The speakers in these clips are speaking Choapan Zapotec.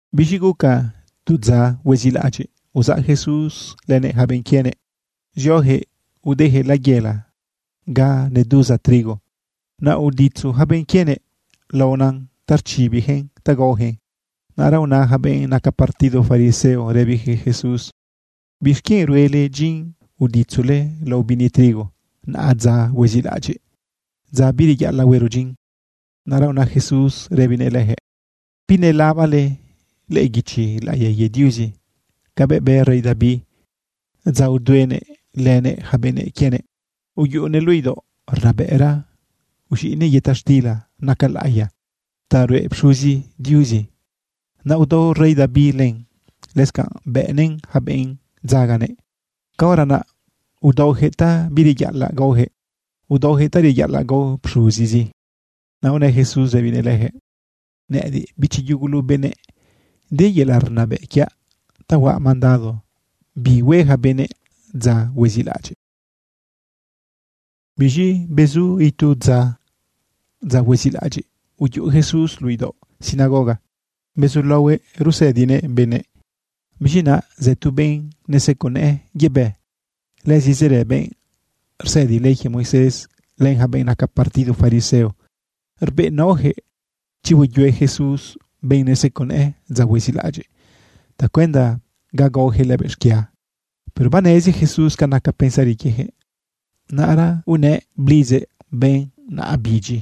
Biz̃i guca tu dza huezilaꞌadyiꞌ, uzaꞌ Jesús lënëꞌ yaca benꞌ quienëꞌ zioyaquëꞌ udeyaquëꞌ layela ga neduza trigo. Naꞌ uditzu yaca benꞌ quienëꞌ laon ta rchibiyaquëꞌn ta gaoyaquëꞌn. Naꞌra una yaca benꞌ naca partido fariseo rëbiyaquëꞌ Jesús: ―¿Bixquienꞌ ruele dyin uditzule lao bini trigo naꞌa dza huezilaꞌadyiꞌ, dza bireyaꞌalaꞌ huero dyin? Naꞌra una Jesús rëbinëꞌ leyaquëꞌ: ―¿Binelabale lëꞌë guichi laꞌiya quie Diuzi cabëꞌ bë rey David dza uduenëꞌ lënëꞌ yaca benëꞌ quienëꞌ? Uyuꞌunëꞌ luꞌu idaoꞌ rnabëꞌra, uz̃iꞌnëꞌ yëta xtila naca laꞌiya ta ruꞌe pxuzi Diuzi. Naꞌ udao rey David len, lëscanꞌ bëꞌnëꞌn yaca benꞌ dzaganëꞌ. Caora naꞌ udaoyaquëꞌ ta bireyaꞌalaꞌ gaoyaquëꞌ. Udaoyaquëꞌ ta reyaꞌalaꞌ gao pxuzizi. Naꞌ unë Jesús rëbinëꞌ leyaquëꞌ: ―Nëꞌëdiꞌ, bichi yugulu benëꞌ, de yelaꞌ rnabëꞌ quiaꞌ ta huaꞌ mandado bi hue yaca benëꞌ dza huezilaꞌadyiꞌ. Biz̃i bezu itu dza, dza huezilaꞌadyiꞌ, uyuꞌu Jesús luꞌu idaoꞌ sinagoga bezulaohuëꞌ rusëdiguëꞌ benëꞌ. Biz̃i naꞌa zë tu benꞌ neseco nëꞌë yebë. Lëzi zërë benꞌ rsëdi ley quie Moisés, len yaca benꞌ naca partido fariseo, rbeꞌnaoyaquëꞌ chi hueyue Jesús benꞌ neseco nëꞌë dza huezilaꞌadyiꞌ tacuenda ga gaoyaquëꞌ lëbëꞌ xquia. Pero banezi Jesús ca naca pensari quieyaquëꞌ. Naꞌra unëꞌ blidzëꞌ benꞌ naꞌa bidyi: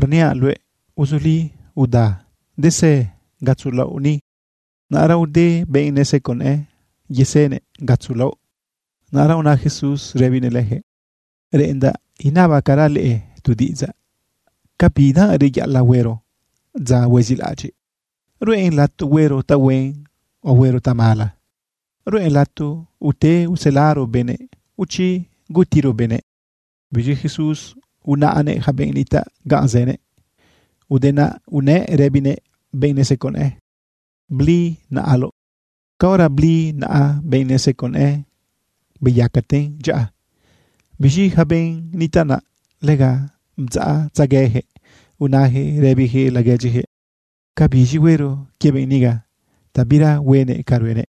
―Rniaꞌ luëꞌ, uzuli uda, desë gatzo laoꞌ ni. Naꞌra ude benꞌ neseco nëꞌë, yasënëꞌ gatzo laoꞌ. Naꞌra una Jesús rëbinëꞌ leyaquëꞌ: ―Reꞌendaꞌ inabacaraꞌ leꞌe tu diꞌidzaꞌ ¿ca bidanꞌ reyaꞌalaꞌ huero dza huezilaꞌadyiꞌ? ¿Ruꞌen lato huero tahuen o huero tamala? ¿Ruꞌen lato ute uselaro benëꞌ o chi gutiro benëꞌ? Biz̃i Jesús unaꞌnëꞌ yaca benꞌ nitaꞌ ganꞌ zënëꞌ. Ude naꞌ unëꞌ rëbinëꞌ benꞌ neseco nëꞌë: ―Bli naꞌaloꞌ. Caora bli naꞌa benꞌ neseco nëꞌë, beyacaten dyaꞌa. Biz̃i yaca benꞌ nitaꞌ naꞌ, lega bdzaꞌtzegueyaquëꞌ unayaquëꞌ rëbiyaquëꞌ laguedyiyaquëꞌ: ―¿Ca biz̃i huero quie benꞌ niga ta bira huenëꞌ ca ruenëꞌ?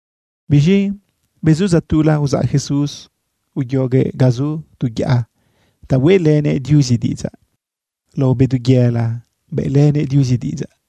Biz̃i bezu dza tula uzaꞌ Jesús uyoguëꞌ ga zu tu yaꞌa ta hueꞌlënëꞌ Diuzi diꞌidzaꞌ. Lao bedu yela bëꞌlënëꞌ Diuzi diꞌidzaꞌ.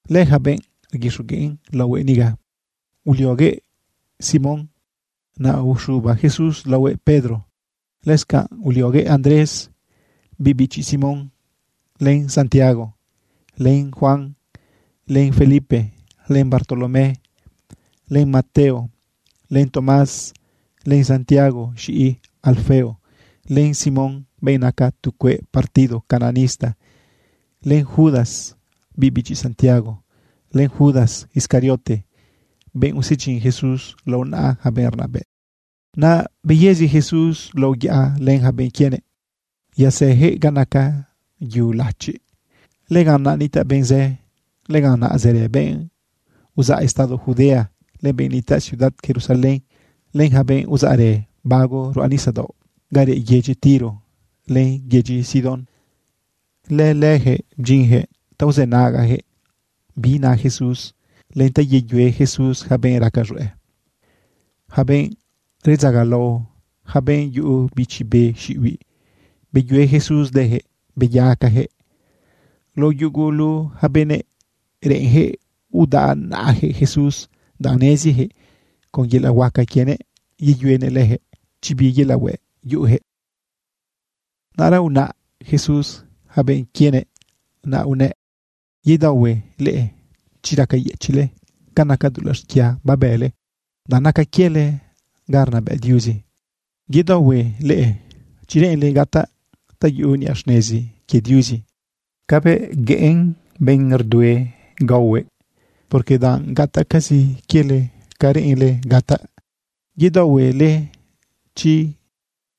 Lëyaca benꞌ rguixogueꞌn laohue niga: Ulioguëꞌ Simón, naꞌ uxuba Jesús laohuëꞌ Pedro. Lëscanꞌ ulioguëꞌ Andrés, biꞌ bichi Simón, len Santiago, len Juan, len Felipe, len Bartolomé, len Mateo, len Tomás, len Santiago z̃iꞌi Alfeo, len Simón, benꞌ naca tu cueꞌ partido cananista, len Judas, biꞌ bichi Santiago, len Judas Iscariote, benꞌ usedyin Jesús lao naꞌa yaca benꞌ rnabëꞌ. Naꞌ beyëzi Jesús lao yaꞌa len yaca benꞌ quienëꞌ. Yazëyaquëꞌ ga naca yu lachiꞌ. Lëganꞌ naꞌ nitaꞌ benꞌ zë. Lëganꞌ naꞌ zërë benꞌ uzaꞌ estado Judea, len benꞌ nitaꞌ ciudad Jerusalén, len yaca benꞌ uzaꞌrë bago ruꞌa nisadaoꞌ ga reꞌ yedyi Tiro len yedyi Sidón. Lëleyaquëꞌ bdyinyaquëꞌ ta uzënagayaquëꞌ bi na Jesús len ta yeyue Jesús yaca benꞌ raca z̃hueꞌ. Yaca benꞌ redzagalao, yaca benꞌ yuꞌu bichi be xiꞌibiꞌ, beyue Jesús leyaquëꞌ beyacayaquëꞌ. Lao yugulu yaca benëꞌ reꞌenyaquëꞌ udaꞌ naꞌayaquëꞌ Jesús, danꞌ neziyaquëꞌ con yelaꞌ huaca quienëꞌ yeyuenëꞌ leyaquëꞌ chi bi yelaꞌ hueꞌ yuꞌuyaquëꞌ. Naꞌra unaꞌ Jesús yaca benꞌ quienëꞌ naꞌ unëꞌ: ―Yedaohue leꞌe chi racayëchiꞌle ca naca dulaꞌ xquia babële, danꞌ naca quiele ga rnabëꞌ Diuzi. ’Yedaohue leꞌe chi reꞌenle gataꞌ ta yuꞌu niꞌa xnezi quie Diuzi cabëꞌ gueꞌen benꞌ rdue gaohuëꞌ, porque danꞌ gataꞌcazi quiele ca reꞌenle gataꞌ. ’Yedaohue leꞌe chi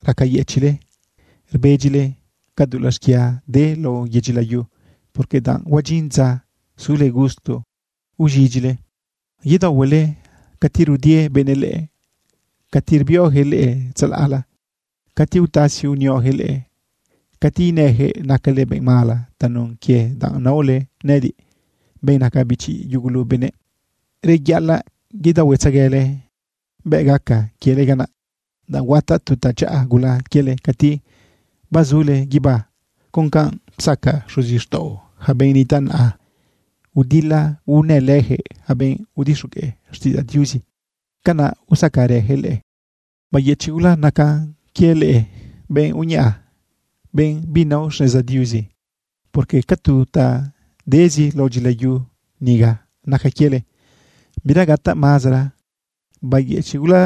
racayëchiꞌle rbedyile ca dulaꞌ xquia de lao yedyi layu, porque danꞌ huadyin dza sule gusto uz̃idyile. ’Yedaohue leꞌe cati rudie benëꞌ leꞌe, cati rbioyaquëꞌ leꞌe tzalaꞌla, cati utasi unioyaquëꞌ leꞌe, cati inëyaquëꞌ nacale benꞌ mala tanun quie danꞌ naole nëꞌëdiꞌ, benꞌ naca bichi yugulu benëꞌ. Reyaꞌalaꞌ yedaohuetzeguele bëꞌ gaca quiele canaꞌ, danꞌ huataꞌ tu tadyaꞌa gula quiele cati bazule guibá. Con canꞌ psaca xuzixtaꞌo yaca benꞌ nitaꞌ naꞌa, udila unëlëyaquëꞌ yaca benꞌ udixogueꞌ xtiꞌidzaꞌ Diuzi, canaꞌ usacarëyaquëꞌ leꞌe. ’Beyëchiꞌ gula nacan quie leꞌe, benꞌ uñaꞌa, benꞌ binao xneza Diuzi, porque ca tu ta dezi lao dyilayu niga naca quiele, bira gataꞌ mazara. ’Beyëchiꞌ gula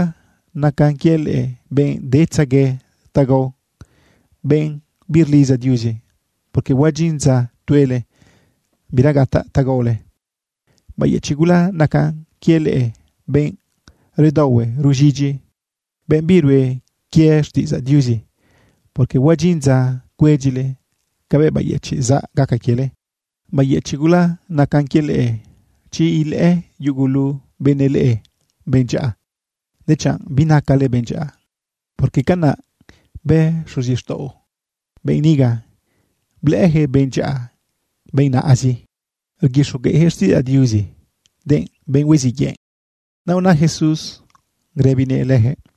nacan quie leꞌe, benꞌ detzague ta gao, benꞌ birlidza Diuzi, porque huadyin dza tuele, bira gataꞌ ta gaole. ’Beyëchiꞌ gula nacan quie leꞌe, benꞌ redaohue ruz̃idyi, benꞌ birue quie xtiꞌidzaꞌ Diuzi, porque huadyin dza cuedyile cabëꞌ bayëchiꞌ zaꞌ gaca quiele. ’Beyëchiꞌ gula nacan quie leꞌe, chi ilëꞌë yugulu benëꞌ leꞌe benꞌ dyaꞌa, dechanꞌ binacale benꞌ dyaꞌa, porque canaꞌ bë xuzixtaꞌo benꞌ niga, blëꞌëyaquëꞌ benꞌ dyaꞌa benꞌ nazi rguixogueꞌyaquëꞌ xtiꞌidzaꞌ Diuzi, denꞌ benꞌ huiziꞌ yëꞌ. Naꞌ una Jesús rëbinëꞌ leyaquëꞌ: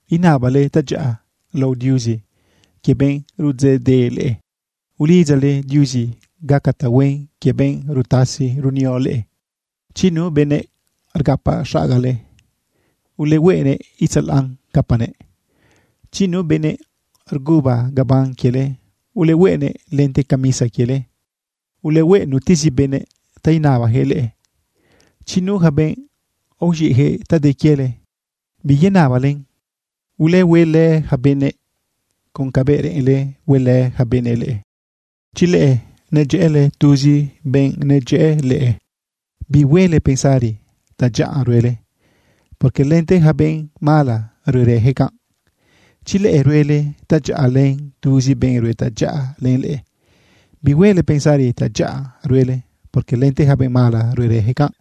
Inabale tadyaꞌa lao Diuzi quie benꞌ rudzeꞌdeꞌ leꞌe, ulidzale Diuzi gaca tahuen quie benꞌ rutasi runio leꞌe. Chi nu benëꞌ rgapaꞌ xagale, ulehueꞌnëꞌ itzalaꞌn capanëꞌ. Chi nu benëꞌ rguba gabán quiele, ulehueꞌnëꞌ lente camisa quiele. Ulehueꞌ nutezi benëꞌ ta inabayaquëꞌ leꞌe. Chi nu yaca benꞌ aoz̃iꞌyaquëꞌ ta de quiele, biyenabalen. Ulehuelë yaca benëꞌ con cabëꞌ reꞌenle huelë yaca benëꞌ leꞌe. ’Chi leꞌe nedyëꞌële tuzi benꞌ nedyëꞌë leꞌe, bihuele pensari tadyaꞌa ruele, porque lente yaca benꞌ mala ruerëyaquëꞌ canꞌ. Chi leꞌe ruele tadyaꞌa len tuzi benꞌ rue tadyaꞌa len leꞌe, bihuele pensari tadyaꞌa ruele, porque lente yaca benꞌ mala ruerëyaquëꞌ canꞌ.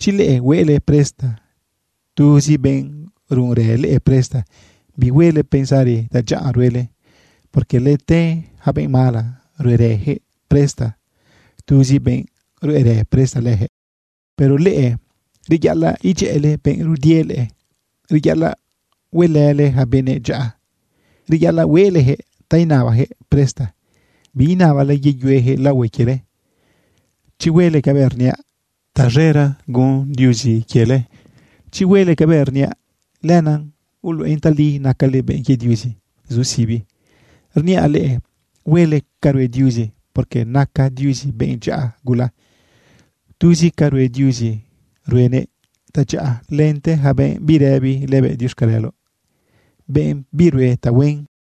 Chi leꞌe hueꞌle presta tuzi benꞌ runrë leꞌe presta, bihuele pensari tadyaꞌa ruele, porque lente yaca benꞌ mala ruꞌerëyaquëꞌ presta tuzi benꞌ ruꞌerë presta leyaquëꞌ. Pero leꞌe, reyaꞌalaꞌ idyëꞌële benꞌ rudie leꞌe, reyaꞌalaꞌ huelële yaca benëꞌ dyaꞌa, reyaꞌalaꞌ hueꞌleyaquëꞌ ta inabayaquëꞌ presta, biinabale yeyueyaquëꞌ laohue quiele. Chi huele cabëꞌ rniaꞌ, taz̃era gun Diuzi quiele. Chi huele cabëꞌ rniaꞌ, lenaꞌ uluꞌen tali nacale benꞌ quie Diuzi zu sibi. Rniaꞌ leꞌe, huele ca rue Diuzi, porque naca Diuzi benꞌ dyaꞌa gula. Tuzi ca rue Diuzi ruenëꞌ tadyaꞌa lente yaca benꞌ birëbi lëbëꞌ diuxcaleloꞌ, benꞌ birue tahuen.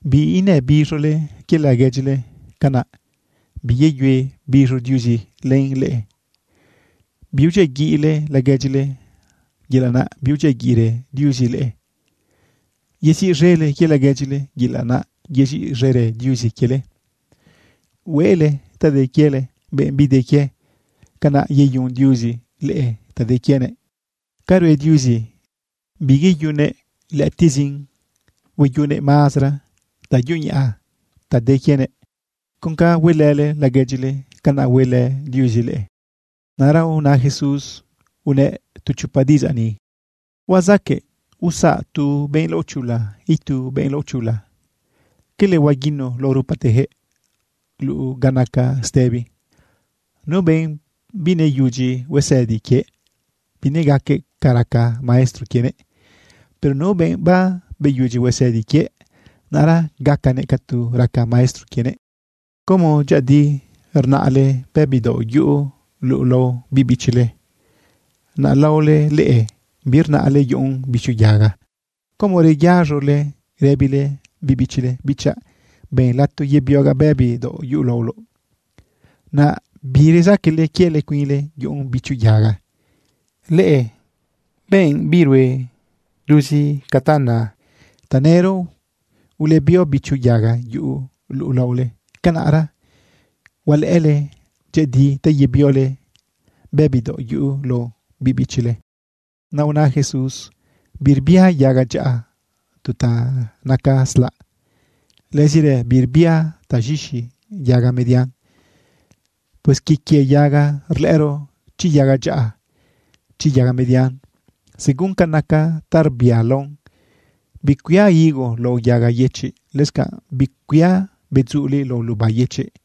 ―Biinëbiz̃ole quie laguedyile, canaꞌ biyeyue biz̃o Diuzi len leꞌe. Biudyiaguiꞌle laguedyile, yelaꞌ naꞌ biudyiaguiꞌrë Diuzi leꞌe. Yeziꞌz̃ele quie laguedyile, yelaꞌ naꞌ yeziꞌz̃erë Diuzi quiele. Hueꞌle ta de quiele benꞌ bide quie, canaꞌ yeyun Diuzi leꞌe ta de quienëꞌ. Ca rue Diuzi biyeyunnëꞌ lëꞌëtiꞌzin, hueyunnëꞌ mazara ta yuñaꞌa ta de quienëꞌ. Con ca huelële laguedyile, canaꞌ huelë Diuzi leꞌe. Naꞌra una Jesús unëꞌ tu chopa diꞌidzaꞌ ni: ―¿Huazaqueꞌ usaꞌ tu benꞌ laochula itu benꞌ laochula? ¿Cala huaguinu lao rupateyaquëꞌ luꞌu ga naca stëbi? Nu benꞌ bineyudyi huesëdi quie, binegaquëꞌ ca raca maestro quienëꞌ. Pero nu benꞌ babeyudyi huesëdi quie, naꞌra gacanëꞌ ca tu raca maestro quienëꞌ. ’¿Como dyëꞌëdi rnaꞌle bëbi daoꞌ yuꞌu luꞌu lao biꞌ bichile? ¿Naꞌ laole leꞌe, birnaꞌle yuꞌun bicho yaga? ¿Como reyaz̃ole rëbile biꞌ bichile: “Bichaꞌ, ben lato yebiogaꞌ bëbi daoꞌ yuꞌu laoloꞌ”? ¿Naꞌ birezaquele quiele cuinle yuꞌun bicho yaga? ¡Leꞌe benꞌ birue tuzi ca nale! Tanëro ulebio bicho yaga yuꞌu luꞌu laole, canaꞌra hualëꞌële dyëꞌëdi ta yebiole bëbi daoꞌ yuꞌu lao biꞌ bichile. Naꞌ una Jesús: ―Birbia yaga dyaꞌa tu ta naca slaꞌ. Lëzirë birbia taz̃ixi yaga median. Pues quie quie yaga rlëꞌëro chi yaga dyaꞌa, chi yaga median, según ca naca ta rbialaon. Bicuia higos lao yaga yëchiꞌ. Lëscanꞌ bicuia bedzuliꞌ lao luba yëchiꞌ.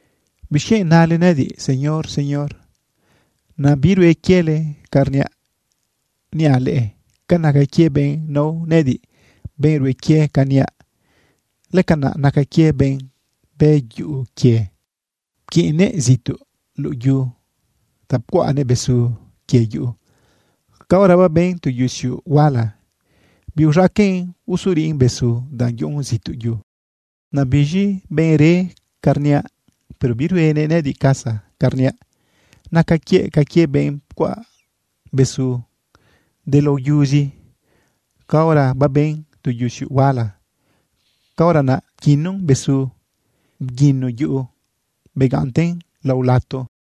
―¿Bixquienꞌ nale nëꞌëdiꞌ, “Señor, Señor”, naꞌ birue quiele ca rniaꞌ? Niaꞌ leꞌe ca naca quie benꞌ nao nëꞌëdiꞌ, benꞌ rue quie ca niaꞌ. Lëcanaꞌ naca quie benꞌ bë yuꞌu quie, pquiꞌnnëꞌ zituꞌ luꞌu yu ta pcuaꞌnëꞌ besu quie yuꞌu. Caora baben tu yusiuꞌ huala, biuz̃aqueꞌn usuriꞌn besu, danꞌ yuꞌun zituꞌ yu. Naꞌ biz̃i benꞌ re ca rniaꞌ, pero biruenëꞌ nëꞌëdiꞌ casa ca rniaꞌ, naca quiëꞌ ca quie benꞌ pcuaꞌ besu delao yuzi. Caora baben tu yusiuꞌ huala, caora naꞌ pquinun besu, bguinu yuꞌu, begaꞌnten lao lato.